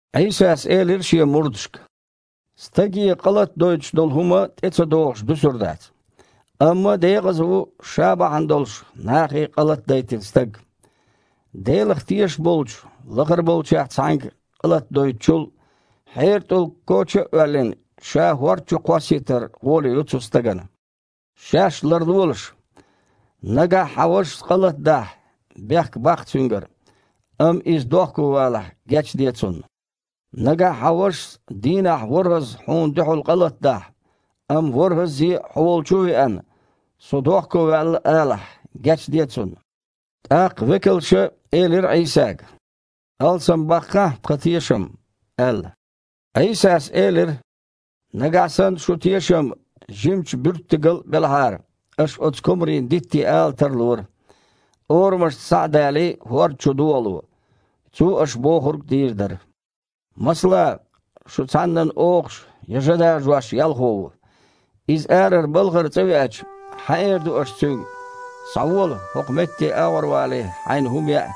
Іийсас элира Шен мурдашка: «Стаге къа латадойтуш долу хІума тІе ца догІуш дуьсур дац. Амма декъаза ву ша бахьана долуш нахе къа латадайтина стаг. Делах тешаш болчу лахара болчех цхьаьнга къа латадойтучул, хьеран тІулг, коча а оьллина, ша хІорда чу кхоссийтар гІоле ю цу стагана. Шаьш ларлолаш! Нагахь хьан вашас къа латадахь, бехк баккха цуьнгара, амма иза дохковалахь, гечде цунна. Нагахь хьан вашас дийнахь ворхІазза хьуна дуьхьал къа латадахь, амма ворхІаззе а хьо волчу а веана: „Со дохковаьлла“, – алахь, гечде цунна». ТІаккха векалша элира Іийсага: «Алсамбаккхахьа тхан тешам», – аьлла. Іийсас элира: «Нагахь санна шун тешам жимачу буьрттигал а белахьара, аш оцу комарийн дитте ала тарлора: „Орамашца схьа а далий, хІорда чу догІало!“ Цо аш бохург дийр дара. Масала, шун цхьаннан охуш я жа дажош ялхо ву. Иза арара балхара цІа веача, хьан эр ду аш цуьнга: „Схьавола, хІокху метте агІорвалий, хьайна хІума яа“?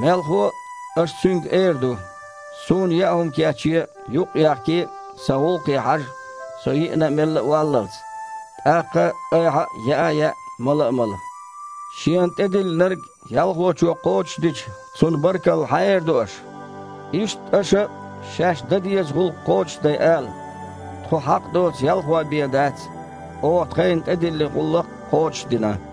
Мелхо а, аш цуьнга эр ду: „Суна яа хІума кечъе, юкъ а ехкий, сан гІуллакхе хьажа со йиина а, мелла валлалц, тІаккха – айхьа а яа а яа, мала а мала“. Шена тІедиллинарг ялхочо кхочушдича, цунна баркалла хьан эр ду аш? Иштта аша а, шаьш дан деза гІуллакх кхочушдай, ала: „Тхо хьакъ доцу ялхой бен дац – оха тхайна тІедиллина гІуллакх кхочушдина“».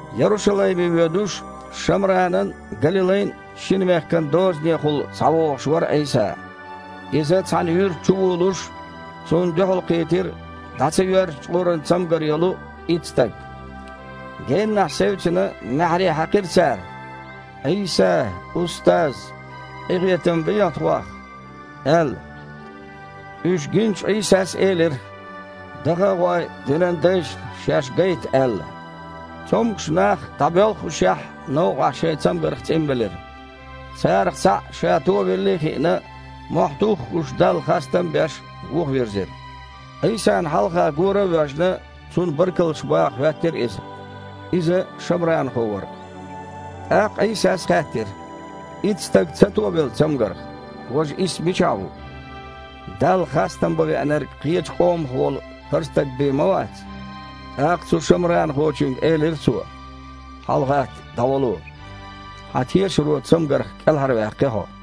Ярушалайме воьдуш, Шамранан а, Галилайн а шина мехкан дозанехула схьавогІуш вара Іийса. Иза цхьана юьрта чувулуш, Цунна дуьхьалкхийтира дІа ца йоьрзу чкъуран цамгар йолу итт стаг. Геннахь севцина, маьхьарий хьаькхира цара: «Іийса! Устаз! Къинхетам бехьа тхох!» – аьлла. Уьш гиначу Іийсас элира: «Даха а гІой, динан дайшна шаьш гайта», – аьлла. Цомгуш нах, дІабоьлххушехь, новкъахь шайн цамгарх цІинбелира. Царах цхьаъ, ша товеллий а хиъна, мохь туххуш Далла хастам а беш, вуха вирзира. Іийсана хьалха гора а воьжна, Цунна баркаллаш баха хІоьттира иза. Иза шамранхо вара. ТІаккха Іийсас хаьттира: «Итт стаг ца товелла цамгарх? Важа исс мичахь ву? Далла хастам бан веанарг кхечу къомах волу хІара стаг бен ма вац?» ТІаккха цу шамранахочуьнга элира Цо: «ХьалагІатта, дІавало. Хьан тешаро цамгарх кІелхьарваьккхи хьо».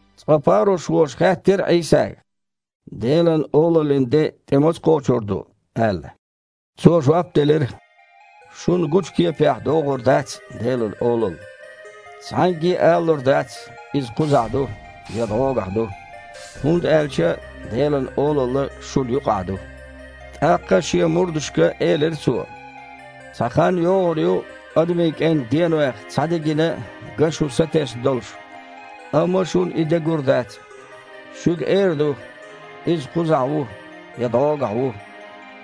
Цкъа парушхоша хаьттира Іийсага: «Делан Олаллин де тІе маца кхочур ду?» – аьлла. Цо жоп делира: «Шуна гучу кепехь догІур дац Делан Олалла. Цхьаьнгге а алалур дац: „Иза кхузахь ду“ я „ДІогахь ду“, хІунда аьлча Делан Олалла шуна юкъахь ду». ТІаккха Шен мурдашка элира Цо: «Цхьа хан йогІур ю Адамийн КІентан денойх цхьа де гина а, ган шу сатесна долуш, амма шуна и де гур дац. Шуьга эр ду: „Иза кхузахь ву“, я „ДІогахь ву“,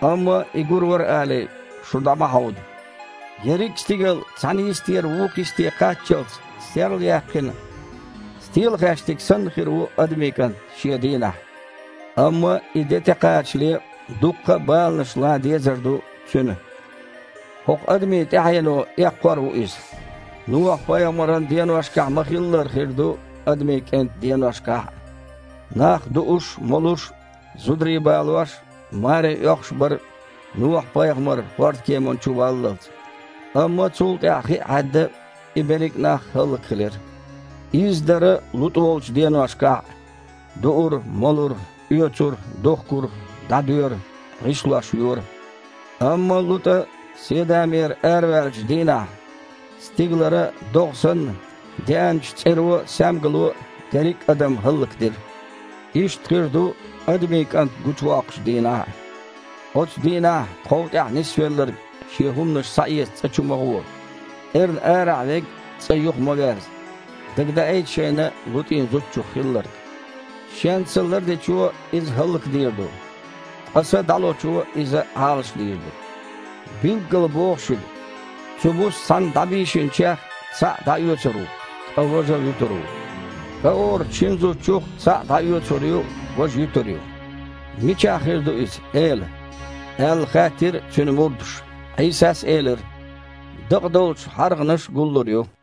амма И гур вара алий, шу дІа ма хьовда. Ерриг а стигал цхьана йистера вукху йисте кхаччалц серлаяьккхина, стелахаьштиг санна, хир ву Адамийн КІант Шен дийнахь. Амма и де тІекхачале, дуккха а баланаш лан дезар ду Цуьнан. ХІокху адамийн тІаьхьено эккхор а ву Иза. Нохьа-пайхамаран деношкахь ма-хиллара хир ду Адамийн КІентан деношкахь а. Нах дууш, молуш, зударий балош, маре оьхуш бара Нохьа-пайхамар хІордан кеманна чу валлалц. Амма цул тІаьхьа хи а хьаьдда, и берриг нах хІаллакьхилира. Изза дара ЛутІа волчу деношкахь а: дуура, молура, оьцура, духкура, дІадоьра, гІишлош йора. Амма ЛутІа Седамера араваьллачу дийнахь стигалара, догІа санна, деанчу цІеро а, саьмгало а дерриг а адам хІаллакдира. Иштта хир ду Адамийн КІант гучувоккхучу дийнахь а. Оцу дийнахь тхов тІехь нисвелларг шен хІуманаш схьаэца цІа чу ма гІо. Эрна арахь верг цІа юха ма верза. Дагадаийта шайна ЛутІин зудчух хилларг. Шен са лардечо иза хІаллакдийр ду, ткъа са дІалочо иза Іалашдийр ду. Билггала боху шуьга: цу буса цхьаьна дІабийшинчех цхьаъ дІаоьцур ву, ткъа важа вуьтур ву. КІа оручу шина зудчух цхьаъ дІаоьцур ю, важа юьтур ю». «Мичахь хир ду иза, Эла?» – аьлла, хаьттира Цуьнан мурдаша. Іийсас элира: «Дакъа долчу хьаргІанаш а гуллур ю».